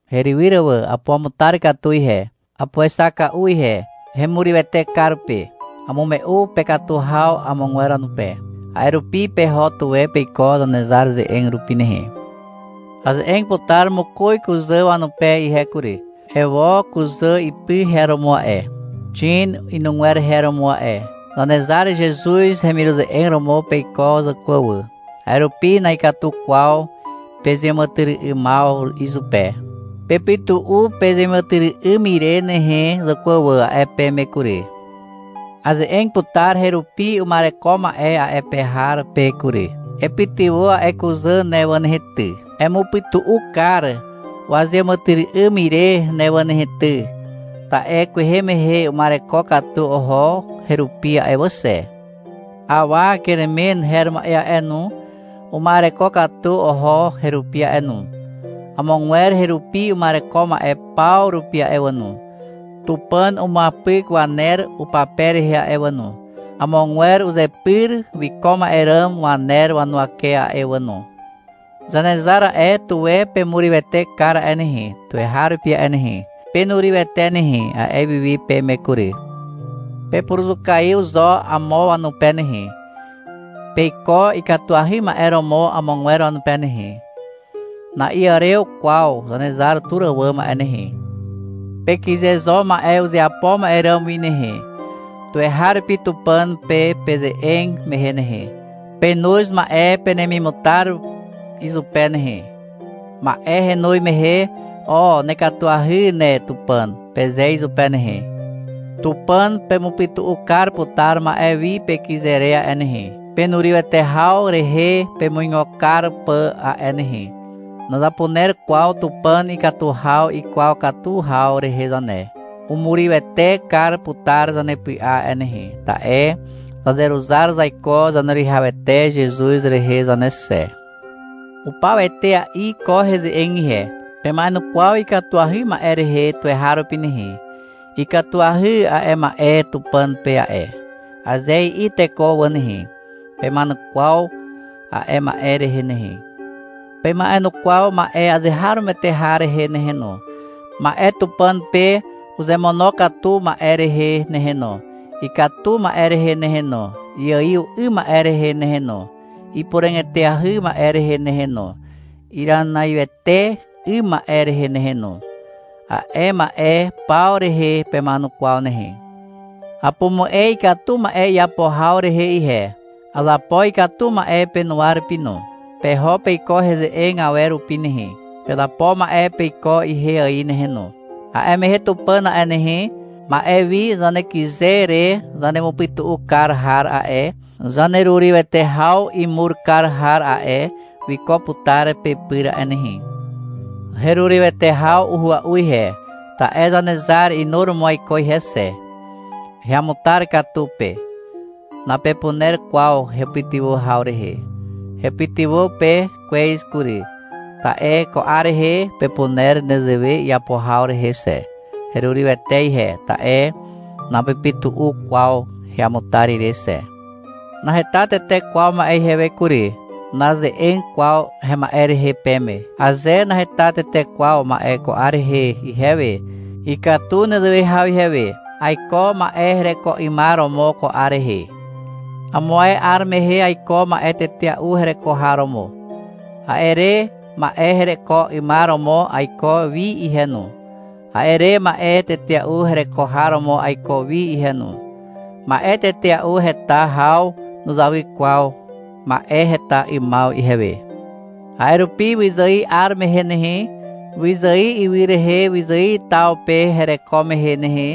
Herywyr wà, apuamutar katu ihe. Apuexaka'u ihe. Hemurywete kar pe. Amume'u pekatu haw amogwer wanupe. A'e rupi peho tuwe peiko Zanezar ze'eg rupi nehe. Aze'eg putar mokoz kuzà wanupe ihe kury. Ewo, kuzà ipy her romo a'e. Xin, inugwer her romo a'e. Zanezar Zezuz hemiruze'eg romo peiko, zàkwà wà. A'e rupi na'ikatu kwaw pezeàmàtyry'ymaw izupe. Pepytu'u pezeàmàtyry'ym ire nehe, zàkwà wà, a'e peme kury. Aze'eg putar herupi uma'ereko ma'e a'e pe har pe kury. — Epytywà a'e kuzà ne wà nehe ty. Emupytu'u kar wazeàmàtyry'ym ire ne wà nehe ty. Ta'e kwehe mehe uma'ereko katu oho herupi a'e wà xe. Awa Keremen her ma'e a'e no, uma'ereko katu oho herupi a'e no. Amogwer herupi uma'ereko ma'e paw rupi a'e wà no, Tupàn umuapyk waner upape rehe a'e wà no, amogwer uzepyr wiko ma'e ràm waner wanuwake a'e wà no. Zanezar a'e, tuwe pemurywete kar a'e nehe, tuweharupi a'e nehe. — Penurywete nehe, a'e wiwi peme kury. Pepuruzukaiw zo amo wanupe nehe. Peiko ikatuahy ma'e romo amogwer wanupe nehe. Na'iàrew kwaw Zanezar tur àwàm a'e nehe. Pekyze zo ma'e uzeapo ma'e ràm wi nehe. Tuweharupi Tupàn pe peze'eg mehe nehe, penoz ma'e penemimutar izupe nehe. Ma'e henoz mehe, — O, nekatuahy ne, Tupàn, peze izupe nehe. Tupàn pemupytu'u kar putar ma'e wi pekyze re a'e nehe, penurywete haw rehe pemuigo kar pà a'e nehe. Nazapuner kwaw Tupàn ikatu haw ikwaw katu haw rehe zane. Umurywete kar putar zanepy'a a'e nehe, ta'e zazeruzar zaiko Zaneruwihawete Zezuz rehe zane xe. Upaw etea'i ko heze'eg ihe. Pema'enukwaw ikatuahy ma'e rehe tuweharupi nehe. — Ikatuahy a'e ma'e Tupàn pe a'e, aze i'i teko wà nehe, pema'enukwaw a'e ma'e rehe nehe. Pema'enukwaw ma'e azeharomoete har rehe nehe no, ma'e Tupàn pe uzemonokatu ma'e rehe nehe no, ikatu ma'e rehe nehe no, iaiw 'ym ma'e rehe nehe no, ipuràg eteahy ma'e rehe nehe no, iranaiwete 'ym ma'e rehe nehe no. A'e ma'e paw rehe pema'enukwaw nehe. Apumu'e ikatu ma'e iapo haw rehe ihe. Azapo ikatu ma'e penuwa rupi no. Peho peiko heze'eg awer rupi nehe. Pezapo ma'e peiko ihe ài nehe no. A'e mehe Tupàn a'e nehe, ma'e wi zanekyze re zanemupytu'u kar har a'e, zanerurywete haw imur kar har a'e, wiko putar pepyr a'e nehe. Herurywete haw uhua'u ihe, ta'e Zanezar inuromo aiko ihe xe. Heamutar katu pe. Napepuner kwaw hepytywà haw rehe. Hepytywà pe kwez kury, ta'e ko 'ar rehe pepuner nezewe iapo haw rehe xe. Herurywete ihe, ta'e napepytu'u kwaw heamutar ire xe. Naheta tete kwaw ma'e ihewe kury. Naze'eg kwaw hema'e rehe peme. Aze naheta tete kwaw ma'e ko 'ar rehe ihewe, ikatu nezewe haw ihewe. Aiko ma'e hereko 'ymar romo ko 'ar rehe. Amo ae 'ar mehe aiko ma'e tetea'u hereko har romo. A'e re ma'e hereko 'ymar romo aiko wi ihe no. A'e re ma'e tetea'u hereko har romo aiko wi ihe no. Ma'e tetea'u heta haw nuzawy kwaw ma'e heta 'ymaw ihewe. A'e rupi wyzài 'ar mehe nehe, wyzài ywy rehe wyzài taw pe hereko mehe nehe,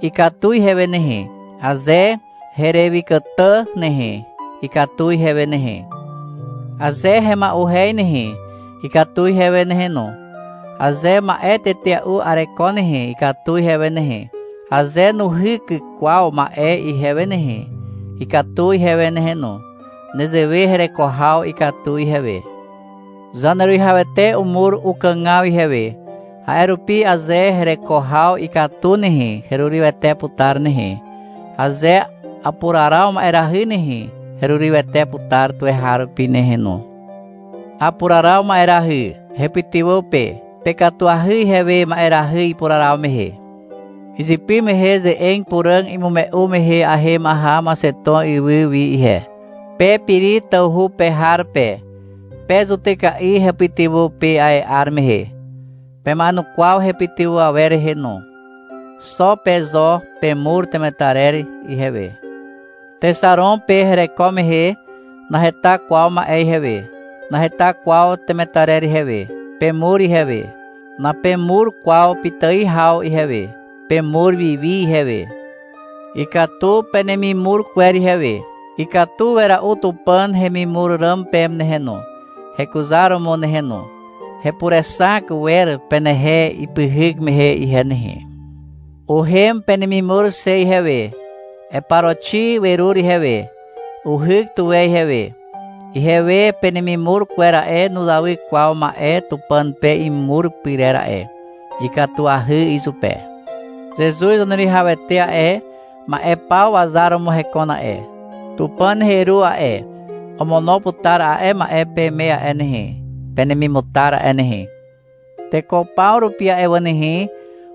ikatu ihewe nehe. Aze herewykàtà nehe, ikatu ihewe nehe. Aze hema'uhez nehe, ikatu ihewe nehe no. Aze ma'e tetea'u areko nehe, ikatu ihewe nehe. Aze nuhyk kwaw ma'e ihewe nehe, ikatu ihewe nehe no. Nezewe hereko haw ikatu ihewe. Zaneruwihawete umur ukàgaw ihewe. A'e rupi aze hereko haw ikatu nehe, herurywete putar nehe. Aze apuraraw ma'erahy nehe, herurywete putar tuweharupi nehe no. Apuraraw ma'erahy. Hepytywà pe. Pekatuahy ihewe ma'erahy ipuraraw mehe. Izypy mehe ze'eg puràg imume'u mehe ahem aha Maxeton ywy wi ihe. Pe Piri tawhu pe har pe, pe zutyka'i hepytywà pe a'e 'ar mehe. Pema'enukwaw hepytywà awer rehe no. Xo pe zo pemur temetarer ihewe. Texaron pe hereko mehe, naheta kwaw ma'e ihewe. Naheta kwaw temetarer ihewe. Pemur ihewe. Napemur kwaw pitài haw ihewe. Pemur wiwi ihewe. Ikatu penemimur kwer ihewe. Ikatu wera'u Tupàn hemimur ràm peme nehe no, hekuzaromo nehe no. Hepurexak wer penehe ipyhyk mehe ihe nehe. Uhem penemimur xe ihewe. Eparoxi werur ihewe. Uhyk tuwe ihewe. Ihewe penemimur kwer a'e, nuzawy kwaw ma'e Tupàn pe imur pyrer a'e. Ikatuahy izupe. Zezuz Zaneruwihawete a'e, ma'e paw wazar romo hekon a'e. Tupàn heru a'e, omono putar a'e ma'e peme a'e nehe, penemimutar a'e nehe. Teko paw rupi a'e wà nehe,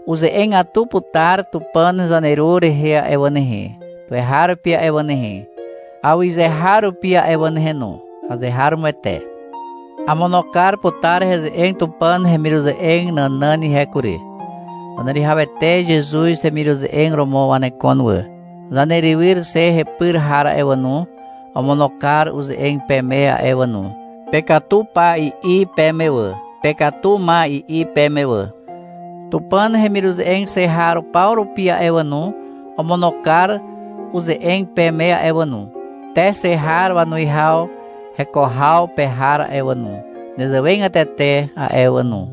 uze'egatu putar Tupàn zaneru rehe a'e wà nehe, tuweharupi a'e wà nehe, awyzeharupi a'e wà nehe no. Azeharomoete. Amono kar putar heze'eg Tupàn hemiruze'eg nànàn ihe kury. Zaneruwihawete Zezuz hemiruze'eg romo wanekon wà. Zanerywyr xe hepyr har a'e wà no, omono kar uze'eg peme a'e wà no, — Pekatu pa, i'i peme wà. — Pekatu ma, i'i peme wà. Tupàn hemiruze'eg xe har paw rupi a'e wà no, omono kar uze'eg peme a'e wà no. Te xe har wanuwihaw heko haw pe har a'e wà no, nezewegatete a'e wà no.